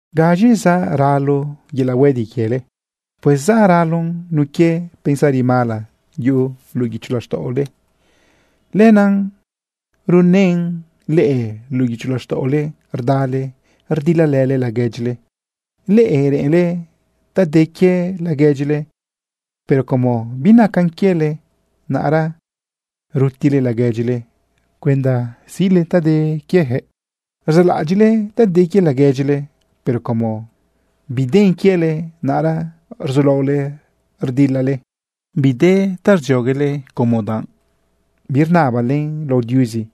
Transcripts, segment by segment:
¿Gaz̃i zaꞌ ralo yelaꞌ huedila quiele? Pues zaꞌ ralon nun quie pensari mala yuꞌu luꞌu guicho laxtaꞌole. Lenaꞌ runën leꞌe luꞌu guicho laxtaꞌole rdale rdilalële laguedyile. Leꞌe reꞌenle ta de quie laguedyile, pero como binacan quiele, naꞌra rutile laguedyile cuenda siꞌle ta de quienëꞌ. Rzaꞌlaꞌadyiꞌle ta de quie laguedyile, pero como biden quiele, naꞌra rzulaole rdilale. Bide ta rdzioguele como danꞌ birnabalen lao Diuzi.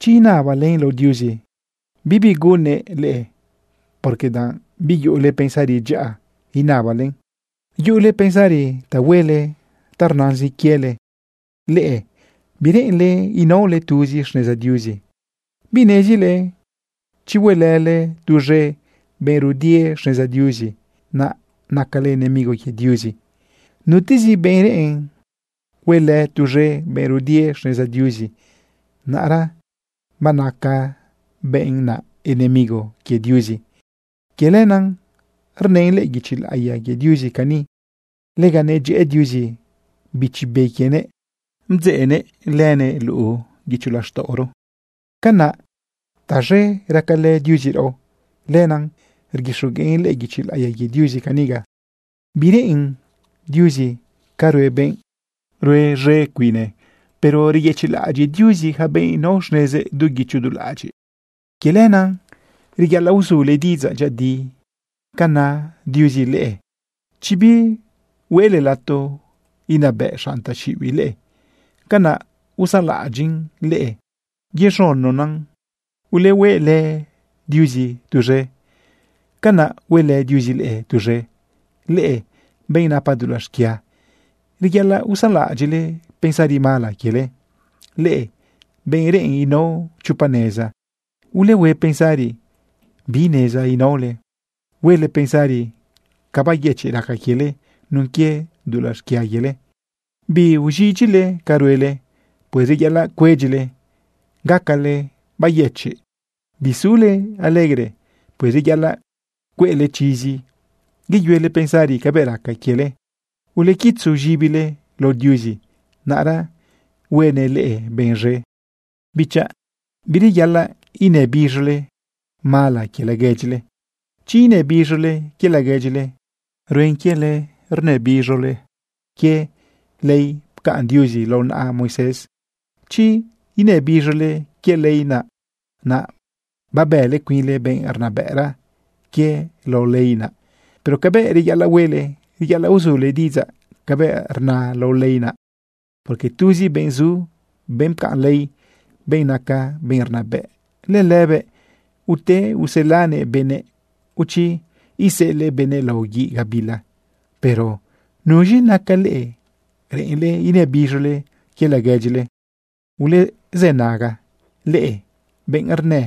Chi inabalen lao Diuzi, bibi gunnëꞌ leꞌe, porque danꞌ biyuꞌule pensari dyaꞌa inabalen. Yuꞌule pensari ta huele ta rnazin quiele. Leꞌe bireꞌenle inaole tuzi xneza Diuzi. ¿Binezile chi huelële tuz̃e benꞌ rudie xneza Diuzi, naꞌ nacale enemigo quie Diuzi? Nutezi benꞌ reꞌen huelë tuz̃e benꞌ rudie xneza Diuzi, naꞌra banaca benꞌ naꞌ enemigo quie Diuzi. Quie lenaꞌ rnën lëꞌë guichi laꞌiya quie Diuzi cani: “Lega nedyëꞌë Diuzi Bichi Be quienëꞌ, bdzeꞌnëꞌ lënëꞌ luꞌu guicho laxtaꞌoro.” Canaꞌ taz̃e racalë Diuzi raꞌo. Lenaꞌ rguixogueꞌn lëꞌë guichi laꞌiya quie Diuzi caniga: “Bireꞌen Diuzi ca rue benꞌ rue z̃e cuine, pero reyëchiꞌlaꞌadyiꞌ Diuzi yaca benꞌ nao xnezëꞌ du guicho du laꞌadyiꞌ.” Quie lenaꞌ reyaꞌalaꞌ uzule diꞌidzaꞌ dyëꞌëdi ca na Diuzi leꞌe. Chi bihueꞌle lato inabëꞌ xanꞌ taxiꞌibiꞌ leꞌe, canaꞌ usanlaꞌadyiꞌn leꞌe yez̃unona. Ulehuelë Diuzi tuz̃e, canaꞌ huelë Diuzi leꞌe tuz̃e. Leꞌe, benꞌ napa dulaꞌ xquia, reyaꞌalaꞌ usanlaꞌadyiꞌle pensari mala quiele. Leꞌe, benꞌ reꞌen inao chopa neza, ulehue pensari bi neza inaole. Huele pensari ca bayëchiꞌ raca quiele nun quie dulaꞌ xquia quiele. Biuz̃idyile ca ruele. Pues reyaꞌalaꞌ cuedyile gacale bayëchiꞌ. Bisule alegre. Pues reyaꞌalaꞌ cueꞌle chizi yeyuele pensari cabëꞌ raca quiele. Ulequitzu z̃ibile lao Diuzi, naꞌra huenëꞌ leꞌe benꞌ z̃e. Bichaꞌ, bireyaꞌalaꞌ inëbiz̃ole mala quie laguedyile. Chi inëbiz̃ole quie laguedyile, ruen quiele rnëbiz̃ole quie ley pcaꞌn Diuzi lao naꞌa Moisés. Chi inëbiz̃ole quie ley naꞌ, naꞌ babële cuinle benꞌ rnabëꞌra quie lao ley naꞌ. Pero cabëꞌ reyaꞌalaꞌ huele, reyaꞌalaꞌ uzule diꞌidzaꞌ cabëꞌ rna lao ley naꞌ, porque tuzi benꞌ zu, benꞌ pcaꞌn ley, benꞌ naca benꞌ rnabëꞌ. Lëlëbëꞌ ute uselanëꞌ benëꞌ, o chi iseꞌelëꞌ benëꞌ lao guiꞌ gabila. ¿Pero nuz̃i naca leꞌe reꞌenle inëbiz̃ole quie laguedyile? Ulezënaga leꞌe benꞌ rnë: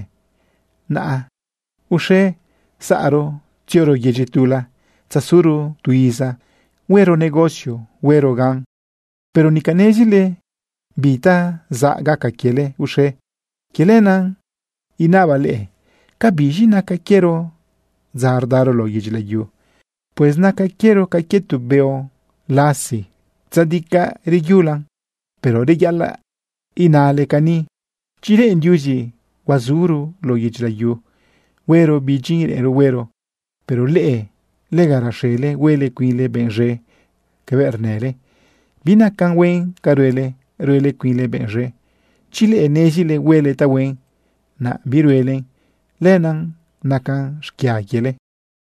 “Naꞌa, uxe, saꞌro tzioro yedyi tula tzasuro tu iza huero negocio huero gan.” Pero nica nezile bi ta zaꞌ gaca quiele uxe. Quie lenaꞌ inabaꞌ leꞌe, ¿cabiz̃i naca quiero dza rdaro lao yedyi layu? Pues naca quiero ca quie tu beo lasi tzadicaꞌ reyulan. Pero reyaꞌalaꞌ inale cani: “Chi reꞌen Diuzi, huazuro lao yedyi layu, huero bi dyin reꞌenro huero.” Pero leꞌe, lega raxele huele cuinle benꞌ z̃e cabëꞌ rnële. Binacan huen ca ruele ruele cuinle benꞌ z̃e. Chi leꞌe nezile huele tahuen, naꞌ biruelen, lenaꞌ nacan xquia quiele.